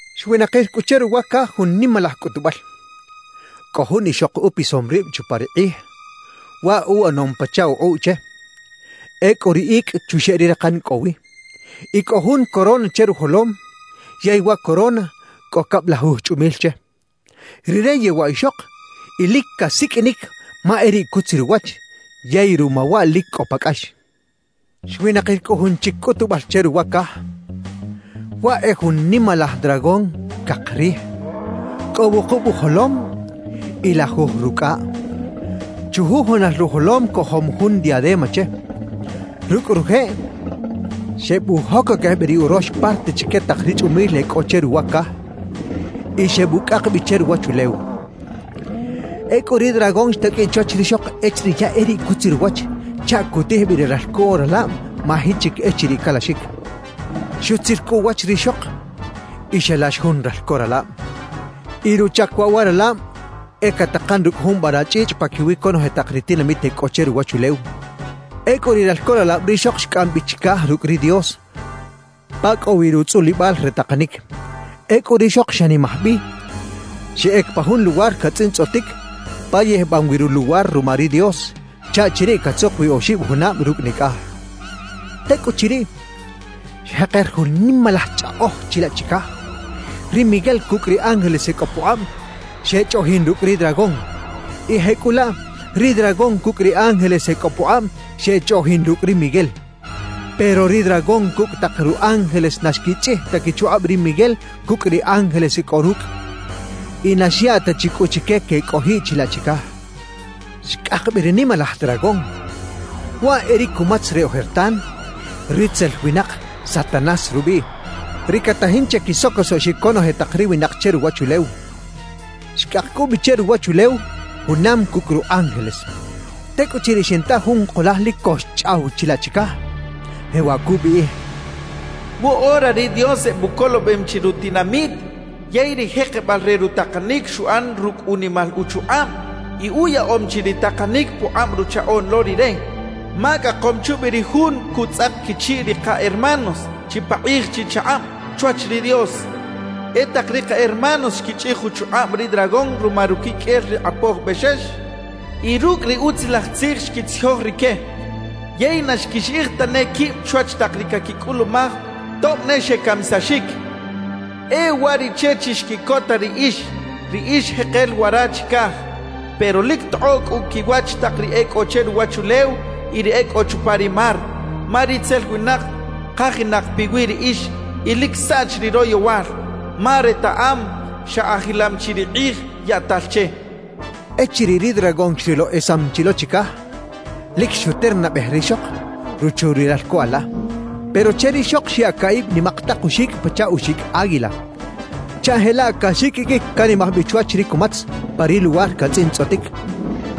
Xwinakir cꞌu che ruwa caj jun nimalaj cꞌutubal: Cꞌo jun ixok upisom rib chupa ri kꞌij, waꞌ uꞌanom pachaꞌ ukꞌuꞌ che. Ecꞌu ri icꞌ chuxeꞌ ri rakan cꞌo wi, y cꞌo jun corona che rujolom yey wa corona cꞌo cablajuj chꞌumil che. Rire yewaꞌ ixok y lic casiqꞌuinic ma e riꞌ cutzir uwach yey ruma waꞌ lic cꞌo pa cꞌax. Xwinakir cꞌu jun chic cꞌutubal che ruwa caj: Waꞌ e jun nimalaj dragón cak rij, cꞌo wukub ujolom y lajuj rucꞌaꞌ. Chujujunal rujolom cojom jun diadema che. Rucꞌ rujeꞌ xebujocoquej bi ri urox parte chique tak ri chꞌumil e cꞌo che ruwa caj y xebucꞌak bi che ruwachulew. Ecꞌu ri dragón xtaqꞌuiꞌ chwach rixok echiriꞌ ya e riꞌ cutzir uwach chaꞌ cutij bi ri ralco ralab maji chic echiriꞌ calaxic. Xutzir cꞌu uwach rixok y xalax jun ralco ralab. Y ruchac waꞌ wa ralab e catakan rucꞌ jun vara chꞌichꞌ paquiwi conoje tak ri tinamit e cꞌo che ruwachulew. Ecꞌu ri ralco ralab rixok xcꞌam bi chicaj rucꞌ ri Dios pa cꞌo wi rutzꞌulibal re takanic. Ecꞌu rixok xanimaj bi, xeꞌec pa jun luwar catzꞌintzꞌotic pa yijbam wi ruluwar ruma ri Dios, chaꞌ chiriꞌ catzuk wi oxib junab rucꞌ nicꞌaj. Tecꞌuchiriꞌ, xjeker jun nimalaj chꞌaꞌoj chilaꞌ chicaj: Ri Miguel cucꞌ ri ángeles e cꞌo pukꞌab xechꞌoꞌjin rucꞌ ri dragón. Y jecꞌulaꞌ ri dragón cucꞌ ri ángeles e cꞌo pukꞌab xechꞌoꞌjin rucꞌ ri Miguel. Pero ri dragón cucꞌ tak ru ángeles na xquichꞌij ta quichukꞌab ri Miguel cucꞌ ri ángeles e cꞌo rucꞌ. Y na xyaꞌ ta chi cꞌu chique quecꞌojiꞌ chilaꞌ chicaj. Xcꞌak bi ri nimalaj dragón, waꞌ e ri cumatz re ojertan, ritzel winak Satanás rubiꞌ, ri catajin che quisocosoꞌxic conoje tak ri winak che ruwachulew. Xcꞌak cꞌu bi che ruwachulew junam cucꞌ ru ángeles. Tecꞌuchiriꞌ xinta jun kulaj lic co xchꞌaw chilaꞌ chicaj, jewaꞌ cubiꞌij: «Woꞌora ri Dios ebucolobem chi rutinamit yey ri jekebal re rutakanic xuꞌan rucꞌ unimal uchukꞌab y uyaꞌom chi ri takanic pukꞌab Ruchaꞌoꞌn lo Rire. Ma cꞌakom chubi ri jun cutzꞌak quichiꞌ ri ka hermanos chipakꞌij chichakꞌab chwach ri Dios. E tak ri ka hermanos xquichꞌij uchukꞌab ri dragón ruma ruquiqꞌuel ri Kꞌapoj Bexex y rucꞌ ri Utzilaj Tzij xquitzijoj rique, yey na xquixiꞌij tane quib chwach tak ri caquicꞌulumaj tob ne xecamisaxic. E uwariꞌche chixquiꞌcota riꞌix, ri ix jekel wara chicaj. Pero lic tokꞌoꞌ cꞌu quiwach tak ri e cꞌo che ruwachulew y ri e cꞌo chupa ri mar, ma ritzel winak kajinak piwi riꞌix y lic saꞌch ri royowal, ma retaꞌam xa ajilam chi ri kꞌij yaꞌtal che» cachaꞌ. Echiriꞌ ri dragón xrilo esam chi lo chicaj, lic xuternabej rixok, ruchu ri ralco ala. Pero che rixok xyaꞌ caꞌib nimak tak uxicꞌ pachaꞌ uxicꞌ águila, chaꞌ jelaꞌ caxiqꞌuiqꞌuic canimaj bi chwach ri cumatz pa ri luwar catzꞌintzꞌotic,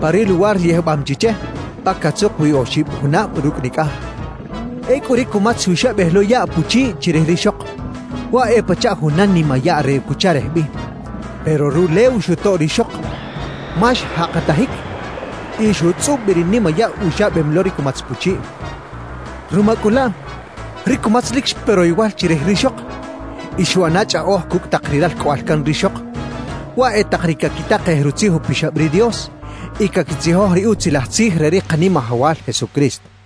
pa ri luwar yijbam chi che, pa catzuk wi oxib junab rucꞌ nicꞌaj. Ecꞌu ri cumatz xuxabej lo yaꞌ puchiꞌ chirij rixok, waꞌ e pachaꞌ juna nimayaꞌ re cucharej bi. Pero rulew xutoꞌ rixok, ma xjakatajic y xutzꞌub bi ri nimayaꞌ uxabem lo ri cumatz puchiꞌ. Ruma cꞌu laꞌ, ri cumatz lic xpe royowal chirij rixok y xuꞌana chꞌaꞌoj cucꞌ tak ri ralcꞌoꞌal can rixok, waꞌ e tak ri caquitakej Rutzij Upixab ri Dios y caquitzijoj ri Utzilaj Tzij re ri Kanimajawal Jesucristo.